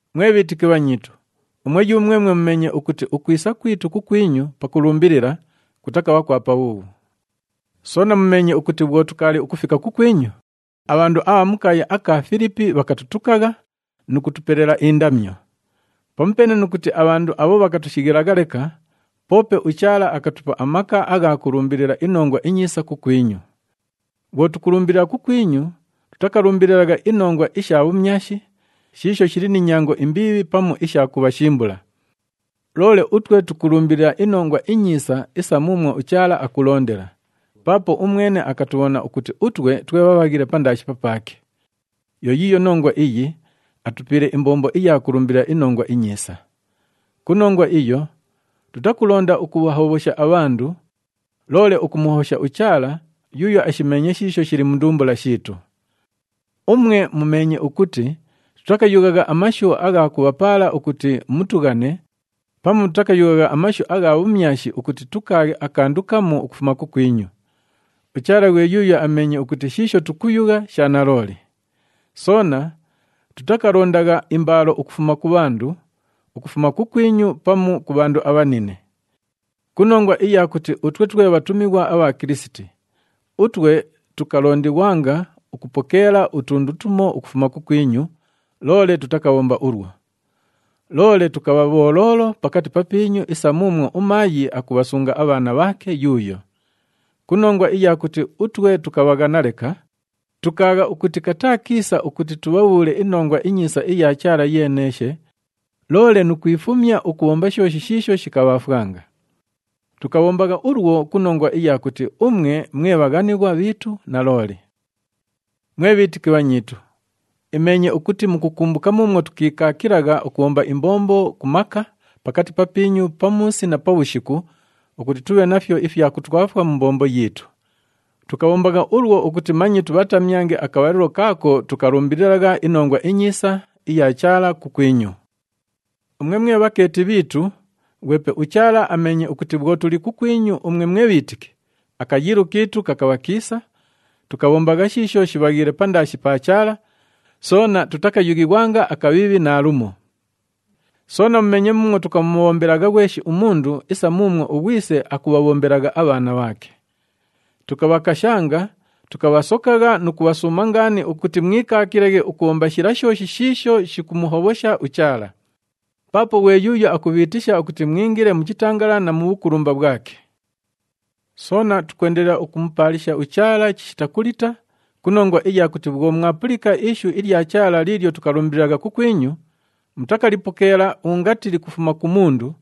Mwe bhiitiki bhanyiitu, umwe yumwemwe mumeenye ukuti ukwisa kwitu kukwinyu pakulumbilila, kutakabha kwa pabhuubhu. Soona mumeenye ukuti bhwo tukaali ukufika kukwinyu, abhandu abha mu kaaya aka Filipi bhakatutukagha nu kutupelela indamyo. Pamupeene nu kuti abhandu abho bhakatushighilagha leka, poope uChaala akatupa amaka agha kulumbilila iNongwa iNyiisa kukwinyu. Bhwo tukulumbilila kukwinyu, tutakalumbililagha inongwa isha bhumyashi, shiisho shili ni nyango imbiibhi pamu isha kubhashimbula. Loole utwe tukulumbilila iNongwa iNyiisa isa muumwo uChaala akulondela, paapo umwene akatubhona ukuti utwe twe bhabhaghile pandaashi papaake. Yo yiiyo nongwa iyi atupiile imbombo iya kulumbilila iNongwa iNyiisa. Ku nongwa iyo, tutakulonda ukubhahobhosha abhandu, loole ukumuhobhosha uChaala, yuuyo ashimeenye shiisho shili mu ndumbula shiitu. Umwe mumeenye ukuti tutakayughagha amashu agha kubhapaala ukuti mutughane, pamu tutakayughagha amashu agha bhumyashi ukuti tukaaghe akandu kamu ukufuma kukwinyu. UChaala ghwe yuuyo ameenye ukuti shiisho tukuyugha, sha nalooli. Soona tutakalondagha imbaalo ukufuma ku bhandu, ukufuma kukwinyu pamu ku bhandu abhanine. Ku nongwa iya kuti utwe twe bhatumighwa abha Kilisiti, utwe tukalondighwanga ukupokeela utundu tumo ukufuma kukwinyu, loole tutakabhomba ulwo. Loole tukabha bholoolo pakati papiinyu isa muumwo umaayi akubhasunga abhaana bhaake yuuyo. Ku nongwa iya kuti utwe tukabhaghana leka, tukaagha ukuti kataa kiisa ukuti tubhabhuule iNongwa iNyiisa iya Chaala yeeneeshe, loole nu kwifumya ukubhomba shooshi shiisho shikabhaafwanga. Tukabhombagha ulwo ku nongwa iya kuti umwe mwe bhaghanighwa bhiitu nalooli. Mwe bhiitiki bhanyiitu, imeenye ukuti mukukumbuka muumwo tukiikaakilagha ukubhomba imbombo ku maka pakati papiinyu pamuusi na pabhushiku ukuti tubhe nafyo ifya kutwafwa mu mbombo yiitu. Tukabhombagha ulwo ukuti manye tubhatamyange akabhalilo kaako tukalumbililagha iNongwa iNyiisa iya Chaala kukwinyu. Umwe mwe bhakeeti bhiitu, ghwepe uChaala ameenye ukuti bhwo tuli kukwinyu umwe mwe bhiitiki, akayiilo kiitu kakabha kiisa, tukabhombagha shiisho shibhaghiile pandaashi pa Chaala, soona tutakayughighwanga akabhiibhi naalumo. Soona mumeenye muumwo tukamubhombelagha ghweshi umundu isa muumwo ughwise akubhabhombelagha abhaana bhaake. Tukabhakashanga, tukabhasokagha nu kubhasuuma ngaani ukuti mwikaakilaghe ukubhomba shila shooshi shiisho shikumuhobhosha uChaala. Paapo ghwe yuuyo akubhiitisha ukuti mwingile mu chitangalala na mu bhukulumba bhwake. Soona tukwendelela ukumupaalisha uChaala chishita kulita ku nongwa iya kuti bhwo mwalipulika ishu ilya Chaala liilyo tukalumbililagha kukwinyu, mutakalipokeela ungati likufuma ku mundu,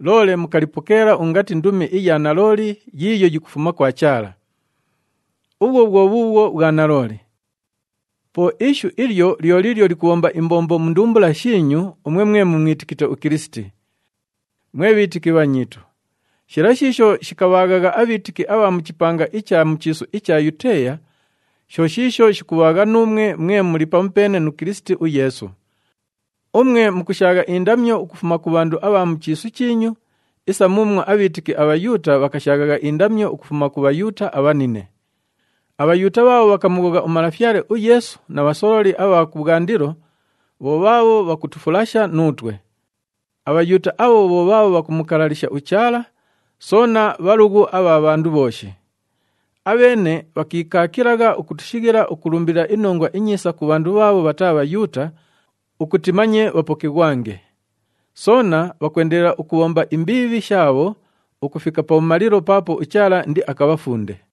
loole mukalipokeela ungati ndumi iya nalooli yiiyo yikufuma kwa Chaala. Ubhwo bhwo bhuubhwo bhwa nalooli. Po Ishu ilyo lyo liilyo likubhomba imbombo mu ndumbula shiinyu umwe mwe mumwitikite uKilisiti. Mwe bhiitiki bhanyiitu, shila shiisho shikabhaaghagha abhiitiki abha mu chipanga icha mu chiisu icha Yuteeya, sho shiisho shikubhaagha nuumwe mwe muli pamupeene nu Kilisiti uYeesu. Umwe mukushaagha indamyo ukufuma ku bhandu abha mu chiisu chiinyu isa muumwo abhiitiki aBhayuuta bhakashaaghagha indamyo ukufuma ku Bhayuuta abhanine. ABhayuuta bhaabho bhakamughogha uMalafyale uYeesu na bhasololi abha kubhwandilo, bho bhaabho bhakutufulasha nuutwe. ABhayuuta abho bho bhaabho bhakumukalalisha uChaala, soona bhalughu abha bhandu bhooshi. Abheene bhakiikaakilagha ukutushighila ukulumbilila iNongwa iNyiisa ku bhandu bhaabho bhataa Bhayuuta ukuti manye bhapokighwange. Soona bhakwendelela ukubhomba imbiibhi shaabho ukufika pabhumalilo paapo uChaala indiakabhafunde.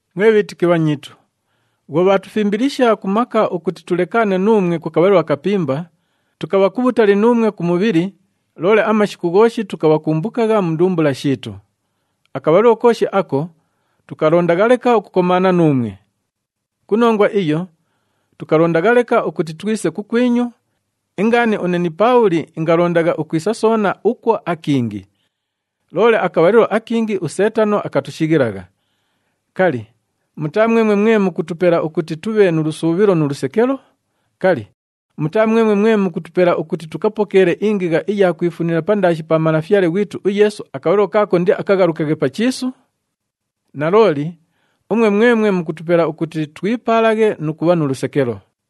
Mwe bhiitiki bhanyiitu, bhwo bhaatufimbilisha ku maka ukuti tulekaane nuumwe ku kabhalilo akapimba, tukabha kubhutali nuumwe ku mubhili, loole amashiku ghooshi tukabhakumbukagha mu ndumbula shiitu. Akabhalilo kooshi ako, tukalondagha leka ukukomaana nuumwe. Ku nongwa iyo, tukalondagha leka ukuti twise kukwinyu, ingaani une ni Paabhuli ingalondagha ukwisa soona ukwo akingi. Loole akabhalilo akingi uSeetano akatushighilagha. Kali, mutaa mwemwe mwe mukutupela ukuti tubhe nu lusuubhilo nu lusekelo? Kali, mutaa mwemwe mwe mukutupela ukuti tukapokeele ingigha iya kwifunila pandaashi pa Malafyale ghwitu uYeesu akabhalilo kaako indiakaghalukaghe pa chiisu? Nalooli, umwe mwemwe mukutupela ukuti twipaalaghe nu kubha nu lusekelo.